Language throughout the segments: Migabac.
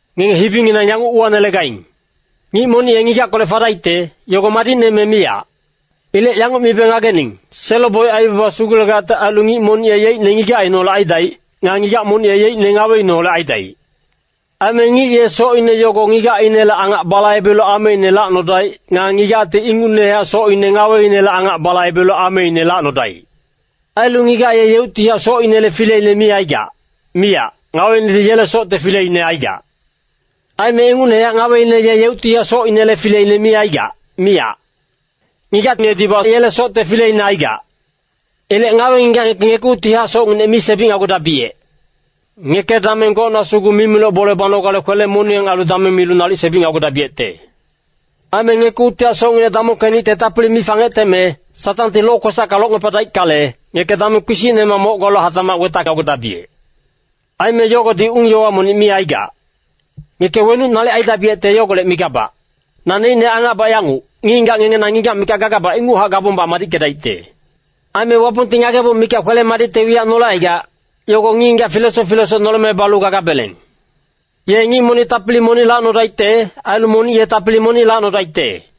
Ngenge hibinginang yanguc uwanelegaing, “Ngic monic ye ngigackolec fadaicte, yogo madicne me miyac.” Ilec yanguc mibe ngagening, selo-boic aibaba sugulegacte ailu ngic monic ye yeicne ngigacineholec aidaic. Nga ngigac monic ye yeicne ngaweineholec aidaic. Aime ngic ye socine yogo ngigacinele angac balaibelu ameine lacnodaic. Nga ngigacti ingucnehac socine ngaweinele angac balaibelu ameine lacnodaic. Ailu ngigac ye yeuctihac socinele fileine mi aigac, miyac, ngaweinedi yele socte fileine aigac. Aime ingucnehac ngaweine ye yeuctihac socinele fileine mi aigac, miyac. Ngigacinedibac yele socte fileine aigac. Ilec ngawe-ngigac ngeke ngekuctihac socnginec mi sebicnagudabiyec. Ngeke dameng gocna sugu mimiloc bole banogale kwele-moniyang ailu dameng milu nalic sebicnagudabiyecte. Aime ngekuctihac socnginec damongkenicte tapili mi fangeteme, Satangti lokwesacka locngepadaickale, ngeke dameng kpisicnemac moc galu hatacmac wetacnagudabiyec. Aime yogodi ung-yowa monic mi aigac. Ngeke wenuc nalic aidabiyecte yogolec migabac. Naneicne angacbac yanguc, ngic-ngigac ngenge na ngigac mikac gagabac ingucnehac gabong madickedaicte. Aime Wapongti ngageboc mikac kwele-madicte wiyac nolecaigac, yogo ngic-ngigac filesoc filesoc noleme balu gagabeleng. Ye ngic monic tapili monic lacnodaicte, ailu monic ye tapili monic lacnodaicte.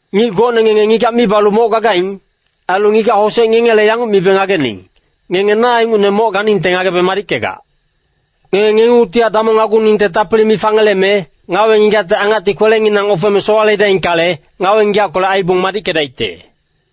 Ngic gocne ngenge ngigac mi balu moc gagaing, ailu ngigac-hosec ngengele yanguc mibe ngagening. Ngenge na ingucne moc ganingte ngagebe madickegac. Ngenge ngengungtihac damongnaguningte tapili mi fangeleme, ngawe-ngigacte angacti kwelenginang ofeme sowaledaingkale, ngawe-ngigackolec aibong madickedaicte.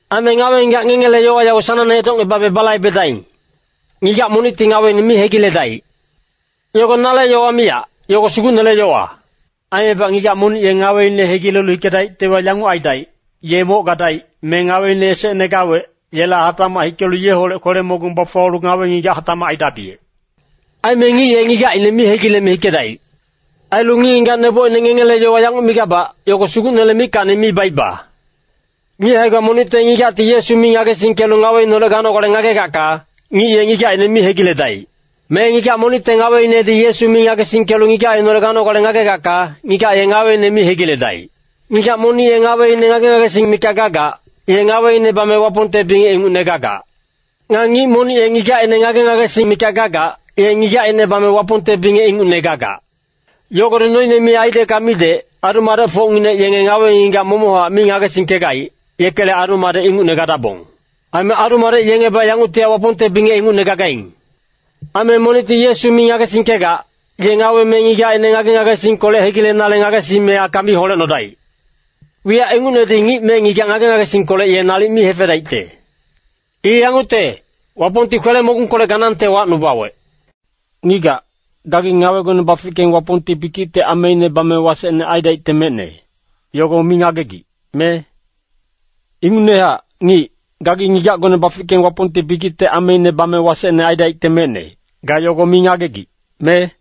Aime ngawe-ngigac ngengele yowa yago sanangne edocngebabe balaibedaing. Ngigac monicti ngaweine mi hegiledaic. Yogo nale yowa miyac, yogo Sugucnele yowa. Aimebac ngigac monic ye ngaweine hegilelu hikedaictewa, yanguc aidaic, ye moc gadaic, me ngaweine esecne gawec, yela hatacmac hikelu yeholec kwele-moniyang bafuwalu ngawe-ngigac hatacmac aidabiyec. Aime ngic ye ngigacine mi hegileme hikedaic. Ailu ngic-ngigac nebocine ngengele yowa yanguc migabac, yogo Sugucnele mickacni mi baiba. Ngic hae-gba monicte ngigacti Yesu mi ngagesingkelu ngaweineholec ganogale ngagegacka, ngic ye ngigacine mi hegiledaic. Me ngigac monicte ngaweinedi Yesu mi ngagesingkelu ngigacineholec ganogale ngagegacka, ngigac ye ngaweine mi hegiledaic. Ngigac monic ye ngaweine ngage-ngagesing mikac gagac, ye ngaweine bame Wapongte bingec ingucne gagac. Nga ngic monic ye ngigacine ngage-ngagesing mikac gagac, ye ngigacine bame Wapongte bingec ingucne gagac. Yogodi noine mi aidecka midec, adu-madecfocnginec yenge ngawe-ngigac momochac mi ngagesingkegaic, yekele adu-madec ingucne gadabong. Aime adu-madec yengebac yanguctihac Wapongte bingec ingucne gagaing. Aime monicti Yesu mi ngagesingkegac, ye ngawe me ngigacine ngage-ngagesingkolec hegilenale ngagesime aka mi holecnodaic. Wiyac ingucnedi ngic me ngigac ngage-ngagesingkolec ye nalic mi hefedaicte. I yangucte, Wapongti kwele-mogungkolec ganangte wacnubawec. Ngigac, gagi ngawegone bafickeng Wapongti bikicte ameine bame wasecne aidaicte mecne, yogo mi ngagegic, me? Ingucnehac, ngic, gagi ngigacgone bafickeng Wapongti bikicte ameine bame wasecne aidaicte mecne, ga yogo mi ngagegic, me?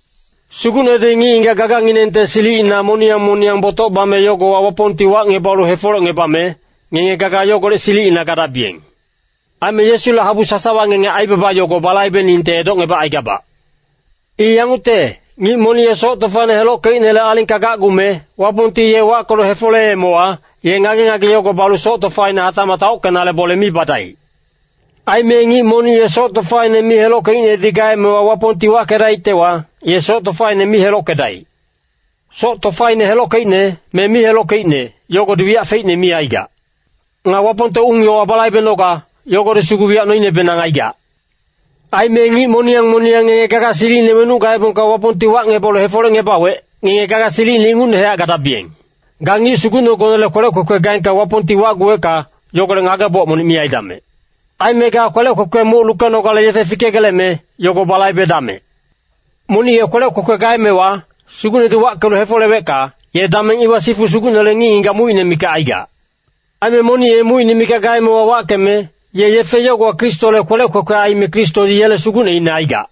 Sugucnedi ngic-ngigac gaganginengte silicina moniyang moniyang botoc bame yogowa Wapongti wacngebalu hefolecngebame, ngenge gaga yogolec silicina gadabiyeng. Aime Yesule habu sasawa ngenge aibaba yogo balaibeningte edocngebacaigabac. I yangucte, ngic monic ye soc tofaine helockeicnele alingka gacgume, Wapongti ye wackelu hefoleemewa, ye ngage-ngage yogo balu soc tofaine hatacmac taockenale bole mi badaic. Aime ngic monic ye soc tofaine mi helockeicnedi gaemewa Wapongti wackedaictewa, ye soc tofaine mi helockedaic. Soc tofaine helockeicne, me mi helockeicne, yogodi wiyac feicne mi aigac. Nga Wapongte ung-yowa balaibenoga, yogodi sugu wiyac noinebenang aigac. Aime ngic moniyang moniyang ngenge gaga silicine wenuc gaebongka Wapongti wacngebalu hefolecngebawec, ngenge gaga silicine ingucnehac gadabiyeng. Ga ngic sugucnegonele kwelec kwekwe gaengka Wapongti wacguwecka, yogolec ngageboc monic mi aidamec. Aime ga kwelec kwekwele muc lukenogale yefe fikegeleme, yogo balaibedamec. Monic ye kwelec kwekwe gaemewa, Sugucnedi wackelu hefolewecka, ye dameng iwa sifu Sugucnele ngic-ngigac mucine mikac aigac. Aime monic ye mucine mikac gaemewa wackeme, ye yefe yogowa Kristole kwelec kwekwe aime Kristodi yele sugucneine aigac.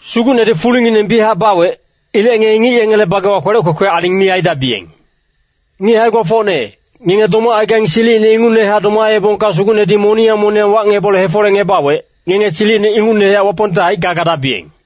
Sugucnedi fulingineng biyachac bawec. Ilec ngenge ngic yengele bagewa kwelec kwekwe aling mi aidabiyeng. Ngic hae-gbafocne, ngenge domacaigaing silicine ingucnehac domaebongka Sugucnedi moniyang moniyang wacngebalu hefolecngebawec, ngenge silicine ingucnehac Wapongte haicka gadabiyeng.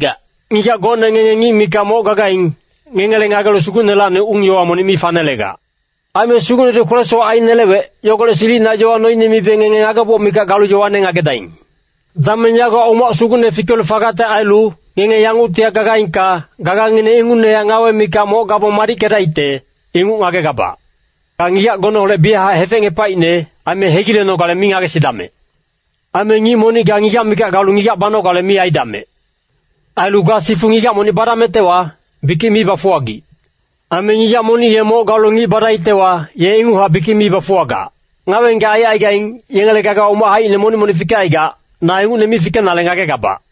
Ngigac gocne ngenge ngic mikac moc gagaing, ngengele ngagelu Sugucnelacni ung-yowa monic mi fanelegac. Aime Sugucnedi kwele-sowac ainelewec, yogolec silicina yowa noine mibe ngenge ngageboc mikac galu yowane ngagedaing. Dameng yagowa umac sugucne fikelu fagacte ailu, ngenge yanguctihac gagaingka, gagangineng ingucnehac ngawe mikac moc gabong madickedaicte, inguc ngagegabac. Ga ngigacgoneholec biyachac hefecngepaicne, aime hegilenogale mi ngagesidamec. Aime ngic monic ga ngigac mikac galu ngigac banogale mi aidamec. Ailu ga sifu ngigac monic badamectewa, bikic mi bafuwagic. Aime ngigac monic ye moc galu ngic badaictewa, ye inguchac bikic mi bafuwagac. Ngawe-ngigac aicaigaing, yengele gagawa umac haicine monic-monic fikecaigac, na ingucne mi fikenale ngagegabac.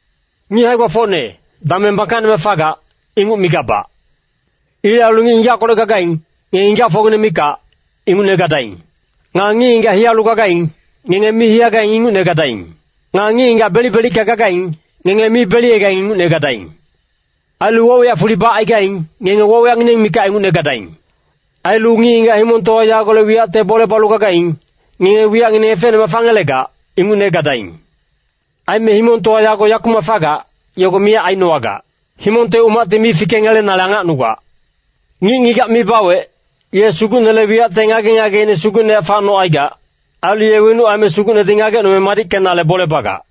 Ngic hae-gbafocne, dameng bangkacnemac fagac, inguc migabac. Ilec ailu ngic ngigackolec gagaing, ngenge ngigacfocngineng mikac, ingucne gadaing. Nga ngic-ngigac hiyalu gagaing, ngenge mi hiyagaing ingucne gadaing. Nga ngic-ngigac belic-belicka gagaing, ngenge mi beliyegaing ingucne gadaing. Ailu woc-wiyac fuli bacaigaing, ngenge woc-wiyacngineng mikac ingucne gadaing. Ailu ngic-ngigac himongtowa yagolec wiyacte bole balu gagaing, ngenge wiyacngineng efecnemac fangelegac, ingucne gadaing. Aime himongtowa yago yakumac fagac, yogo miyac ainowagac. Himongte umacti mi fikengelenale angacnugac. Ngic ngigac mi bawec, ye Sugucnele wiyacte ngage-ngageine sugucnehac facnocaigac. Ailu ye wenuc aime Sugucnedi ngagecnome madickenale bole bagac.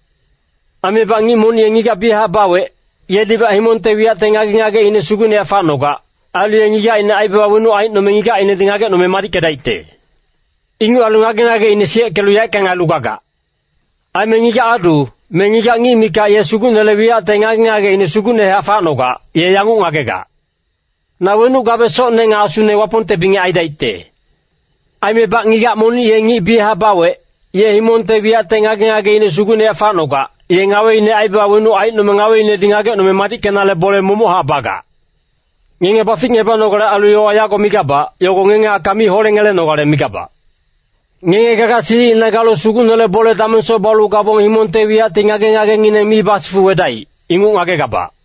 Aimebac ngic monic ye ngigac biyachac bawec, yedibac himongte wiyacte ngage-ngageine sugucnehac facnogac. Ailu ye ngigacine aibaba wenuc aicnome ngigacinedi ngagecnome madickedaicte. Inguc ailu ngage-ngageine siyeckelu yaeckang ailu gagac. Aime ngigac-adu, me ngigac ngic mikac ye Sugucnele wiyacte ngage-ngageine sugucnehac facnogac, ye yanguc ngagegac, “Na wenuc gabe socne nga asune Wapongte bingec aidaicte.” Aimebac ngigac monic ye ngic biyachac bawec, ye himongte wiyacte ngage-ngageine sugucnehac facnogac, ye ngaweine aibaba wenuc aicnome ngaweinedi ngagecnome madickenale bole momochac bagac. Ngenge baficngebanogale ailu yowa yago migabac, yogo ngenge aka mi holengelenogale migabac. Ngenge gaga silicina galu Sugucnele bole damengsoc balu gabong himongte wiyacti ngage-ngagengineng mi basifuwedaic, inguc ngagegabac.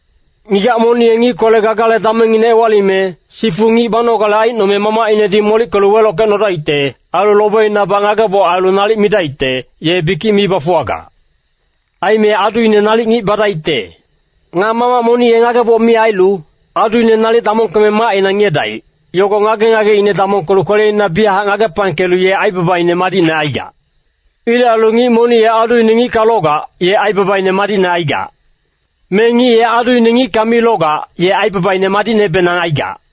Ngigac monic ye ngickolec gagale damengngine ewalime, sifu ngic banogale aicnome mamacinedi molickelu welockecnodaicte. Ailu lobeinabac ngageboc ailu nalic midaicte, ye bikic mi bafuwagac. Aime aduine nalic ngic badaicte. Nga mamac monic ye ngageboc mi ailu, aduine nalic damongkeme macina ngiyedaic, yogo ngage-ngageine damongkelu kweleina biyac ngagepangkelu ye aibabaine madicne aigac. Ilec ailu ngic monic ye aduine ngicka logac, ye aibabaine madicne aigac. Me ngic ye aduine ngicka mi logac, ye aibabaine madicnebenang aigac.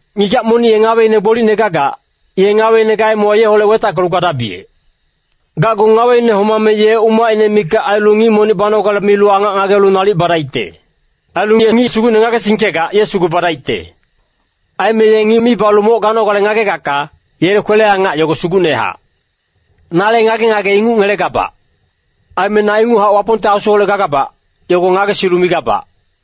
Ngigac monic ye ngaweine gbolicne gagac, ye ngaweine gaemewa yeholec wetackelu gadabiyec. Gacgu ngaweine homame ye umacine mikac ailu ngic monic banogale milu angac ngagelu nalic badaicte. Ailu ye ngic Sugucne ngagesingkegac ye sugu badaicte. Aime ye ngic mi balu moc ganogale ngagegacka, yele kwele-angac yogo sugucnehac. Nale ngage-ngage inguc ngelegabac. Aime na inguchac Wapongte Asuholec gagabac, yogo ngagesilu migabac.